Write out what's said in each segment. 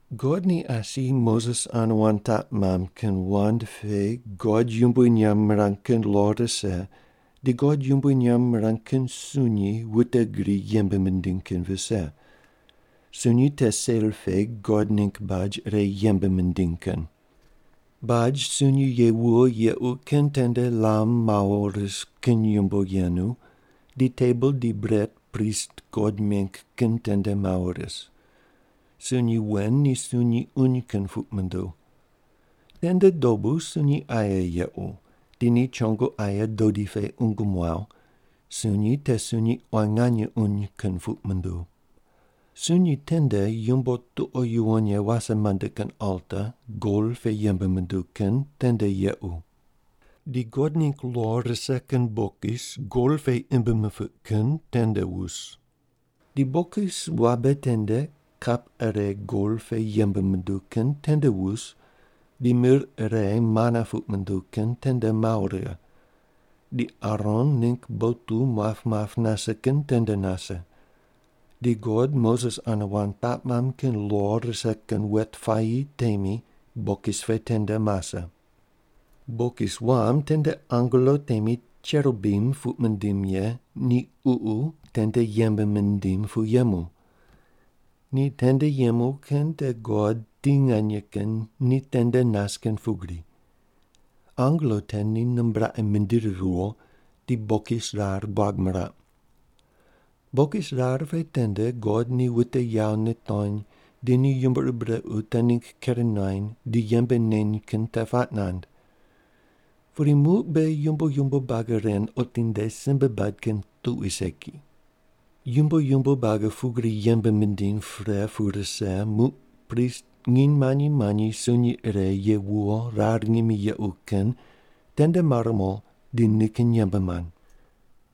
God ni asi Moses ane wand taq mamb kin wand pe God yumbui nyamb mirang kin lo rise di God yumbui nyamb mirang kin sunyi wute gri yembe mindiny kin vise. Sunyi te sel pe God ningg baj ire yembe mindiny kin. Baj sunyi ye wuwo yequ kin tende lam mawo ris kin yumbo yenu, di tebol di bret prist God meng kin tende mawo ris. Sunyi wen ni sunyi uny kin puq munduw. Tende dobu sunyi aye yequ, di ni chongo aye dodi pe qungu muaw, sunyi te sunyi quan nganye uny kin puq munduw. Sunyi tende yumbo tuqo yuwon ye wase mande kin alta gol pe yembe munduw kin tende yequ. Di God ningg lo rise kin bokis gol pe imb mipiq kin tende wus. Di bokis wabe tende kap ire gol pe yembe munduw kin tende wus di mir ire mana puq munduw kin tende mawo righe, di Aron ningg botu muap muap nase kin tende nase, di God Moses ane wand taq mamb kin lo rise kin wet puayi temi bokis pe tende mase. Bokis wam tende angelo temi cherubim puq mindim ye ni ququ tende yembe mindim pu yemu. Ni tende yemu kin te God ti nganye kin ni tende nas kin pugri. Angelo te ni nimbraqe mindiri riwo di bokis rar buag miraq. Bokis rar pe tende God ni wute yawo nitony di ni yumbo ur brequ te ningg ker nuany di yembe neny kin te puaq nand. Pudi muq beghi yumbo yumbo buagi ren otinde simbe bad kin tuqui segi. Yumbo yumbo buagi pugri yembe mindiny pre pu rise muq prist nginy manyi manyi sunyi ire ye wuwo rar ngimi yequ kin tende mar mo di nikin yembe mand.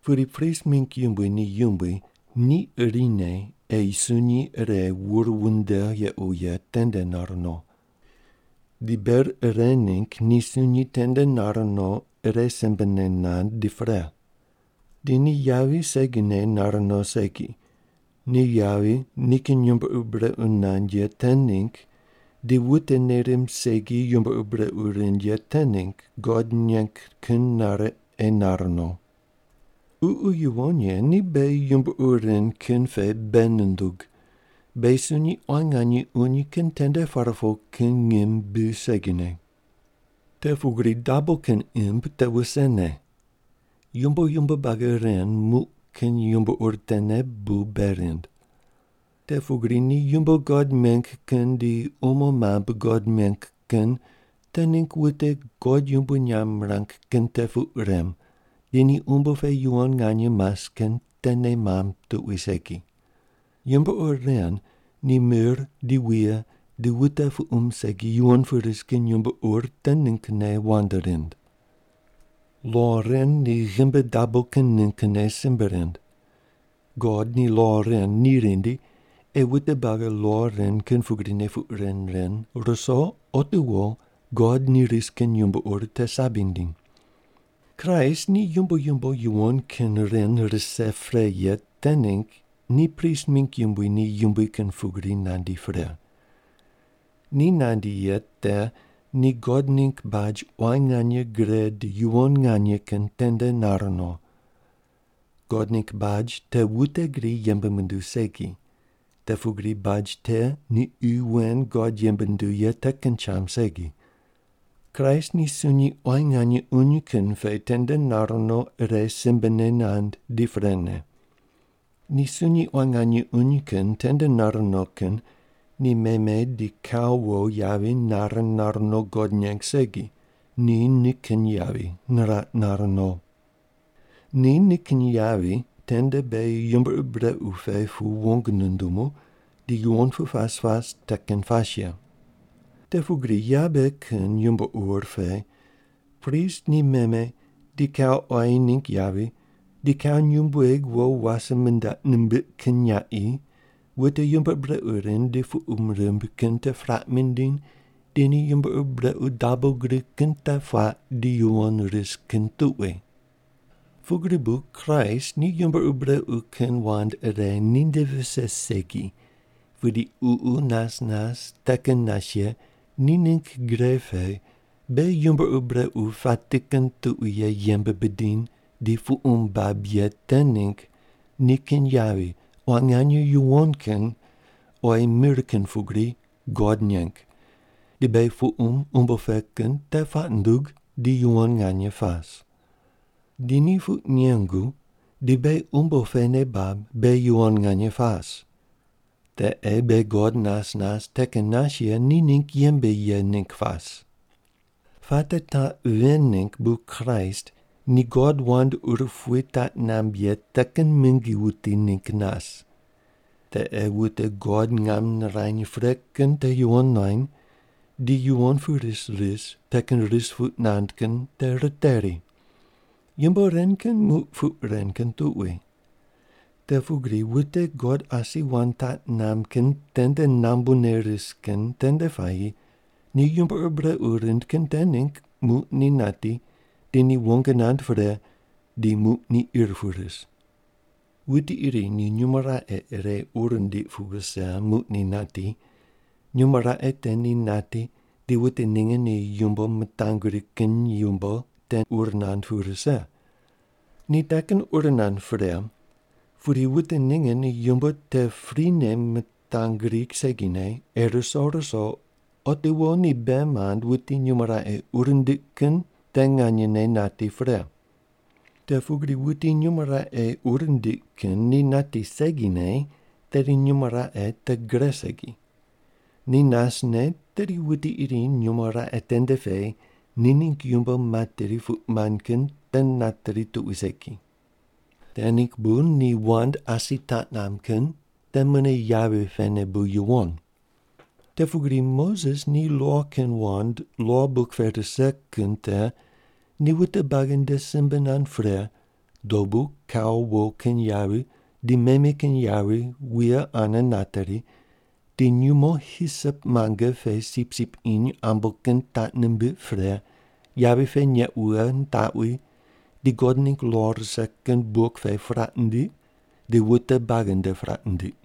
Pudi prist mingg yumbui ni yumbui ni irine ei sunyi ire wur wunde yequ ye tende nar no. Di ber ire ningg ni sunyi tende nar no ire simbene nand di pre. Di ni yavi segine nar no segi, ni yavi nikin yumbo ur brequ nand ye te ningg di wute nei rimb segi yumbo ur brequ rind ye te ningg God neng kin nare ei nar no. Ququ Yuwon Ye ni beghi yumbo ur ren kin pe bei nundug, beghi sunyi quan nganye uny kin tende par po kin ngim bi segine. Te pugri dabo kin imb te wusene. Yumbo yumbo buagi ren muq kin yumbo ur tene bu bei rind. Te pugri ni yumbo God meng kin di umo mambui God meng kin te ningg wute God yumbui nyamb mirang kin te puq rem di ni umbo pe yuwon nganye mas kin te nei mamb tuqui segi. Yumbo ur ren ni mir di wuye di wute puqum segi yuwon pu ris kin yumbo ur te ninggne wand rind. Lo ren ni ghimbi dabo kin ninggne simbe rind. God ni lo ren ni rindi ei wute buagi lo ren kin pugrine puq ren ren ruso otiwo God ni ris kin yumbo ur te sabi nindiny. Kraist ni yumbo yumbo yuwon kin ren rise pre ye te ningg ni prist mingg yumbui ni yumbui kin pugri nandi pre. Ni nandi ye te ni God ningg baj quan nganye gre di yuwon nganye kin tende nar no. God ningg baj te wute gri yembe munduw segi, te pugri baj te ni qi wen God yembe nunduw ye te kin cham segi. Kraist ni sunyi quan nganye uny kin pe tende nar no ire simbene nand di prene. Ni sunyi quan nganye uny kin tende nar no kin ni meme di kau wo yavi nare nar no God neng segi, ni nikin yavi niraq nar no. Ni nikin yavi tende beghi yumbo ur brequ pe pu wong nundumu di yuwon pu pas pas te kin pas ye. Te pugri yabe kin yumbo ur pe prist ni meme di kau quayi ningg yavi di kau nyumbueg wo wase mindaq nimbiq kin nyaqi wute yumbo ur brequ rind di puqum rimb kin te puraq mindiny di ni yumbo ur brequ dabo gri kin te puaq di yuwon ris kin tuqui. Pugri bu Kraist ni yumbo ur brequ kin wand ire ni nde vise segi pudi Ququ nas nas te kin nas ye ni ningg gre pe beghi yumbo ur brequ pati kin tuqui ye yembe bidiny di puqum bab ye te ningg nikin yavi quan nganye yuwon kin oyi mir kin pugri God neng di beghi puqum umbo pe kin te puaq nundug di yuwon nganye pas. Di ni puq nengu di beghi umbo pe nei bab beghi yuwon nganye pas. Te ei beghi God nas nas te kin nas ye ni ningg yembe ye ningg pas. Puate taq ven ningg bu Kraist ni God wand urupui taq namb ye te kin mingi wuti ningg nas. Te ei wute God ngam nirany pre kin te yuwon nuany di yuwon pu ris ris te kin ris puq nand kin te riteri. Yumbo ren kin muq puq ren kin tuqui. Te pugri wute God asi wand taq namb kin tende nambune ris kin tende puayi ni yumbo ur brequ rind kin te ningg muq ni nati di ni wong nand pre di muq ni ir pu ris. Wuti iri ni nyumo raqe ire ur nindiq pu wuse muq ni nati, nyumo raqe te ni nati di wute ninge ni yumbo mitangri kin yumbo te ur nand pu rise. Ni te kin ur nand pre, pudi wute ninge ni yumbo te prine mitangri segine ei ruso ruso otiwo ni bei mand wuti nyumo raqe ur nindiq kin te nganyene nati pre. Te pugri wuti nyumo raqe ur nindiq kin ni nati segine tedi nyumo raqe te gre segi. Ni nasne tedi wuti iri nyumo raqe tende pe ni ningg yumbo materi puq nand kin te nateri tuqui segine. Te ningg bu ni wand asi taq namb kin te mune yavi pene bu yuwon. Te pugri Moses ni lo kin wand lo buk pe rise kin te ni wute buagi nde simbe nand pre dobu kau wo kin yavi di meme kin yavi wuye ane nateri, di nyumo hisop muange pe sipsip iny ambo kin taq nimbiq pre yavi pe neq wughe nitaqwi di God ningg lo rise kin buk pe puraq nindiq di wute buagi nde puraq nindiq.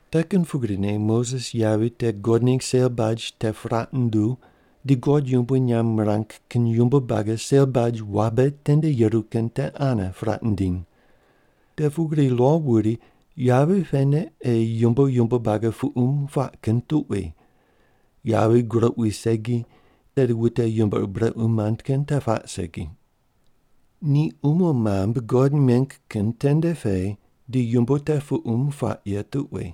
Te kin pugrine Moses yavi te God ningg sel baj te puraq nunduw di God yumbui nyamb mirang kin yumbo buagi sel baj wabe tende yeru kin te ane puraq nindiny. Te pugri lo wuri, yavi pene ei yumbo yumbo buagi puqum puaq kin tuqui, yavi groq wi segi tedi wute yumbo ur brequ mand kin te puaq segi. Ni umo mambui God meng kin tende pe di yumbo te puqum puaq ye tuqui.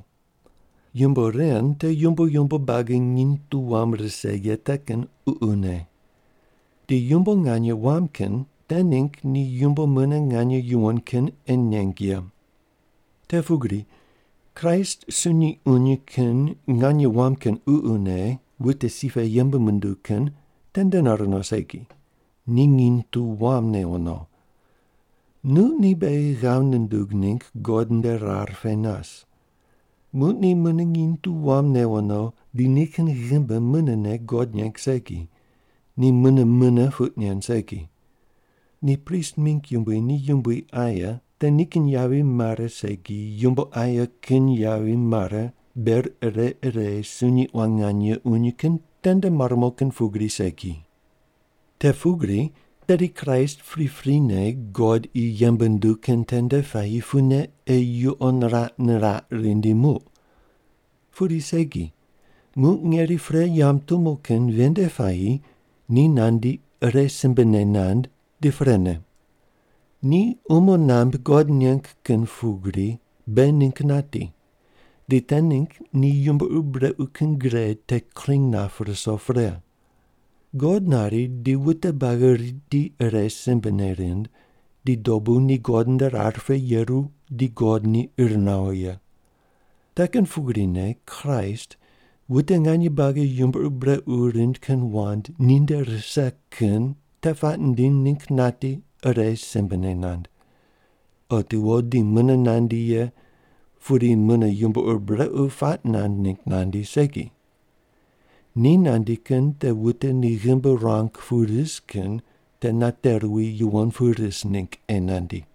Yumbo ren te yumbo yumbo buagi nginy tu wam rise ye te kin ququne. Di yumbo nganye wam kin te ningg ni yumbo mune nganye yuwon kin ei neng ye. Te pugri Kraist sunyi uny kin nganye wam kin ququne wute si pe yembe munduw kin tende nar no segi, ni nginy tu wam newo no. Muq ni beghi ghav nundug ningg God nde rar pe nas. Muq ni mune nginy tu wam newo no di nikin ghimbi munene God neng segi, ni mune mune puq nen segi. Ni prist mingg yumbui ni yumbui aye te nikin yavi mare segi yumbo aye kin yavi mare ber ire ire sunyi quan nganye uny kin tende mar mo kin pugri segi. Te pugri tedi Kraist priprine God qi yembe nunduw kin tende puayi pune ei yuqo niraq niraq rindi muq. Pudi segi, muq ngeri pre yamb tumo kin ven nde puayi ni nandi ire simbene nand di prene. Ni umo nambui God neng kin pugri beghi ningg nati di te ningg ni yumbo ur brequ kin gre te kring nap ruso pre. God nari di wute buagi riti ire simbene rind, di dobu ni God nde rar pe yeru di God ni ir nawo ye. Te kin pugrine Kraist wute nganye buagi yumbo ur brequ rind kin wand ni nde rise kin te puaq nindiny ningg nati ire simbene nand. Otiwo di mune nandi ye, pudi mune yumbo ur brequ puaq nand ningg nandi segi. Ni nandi kin te wute ni ghimbi ruang pu ris kin te nate ruwi yuwon pu ris ningg ei nandi.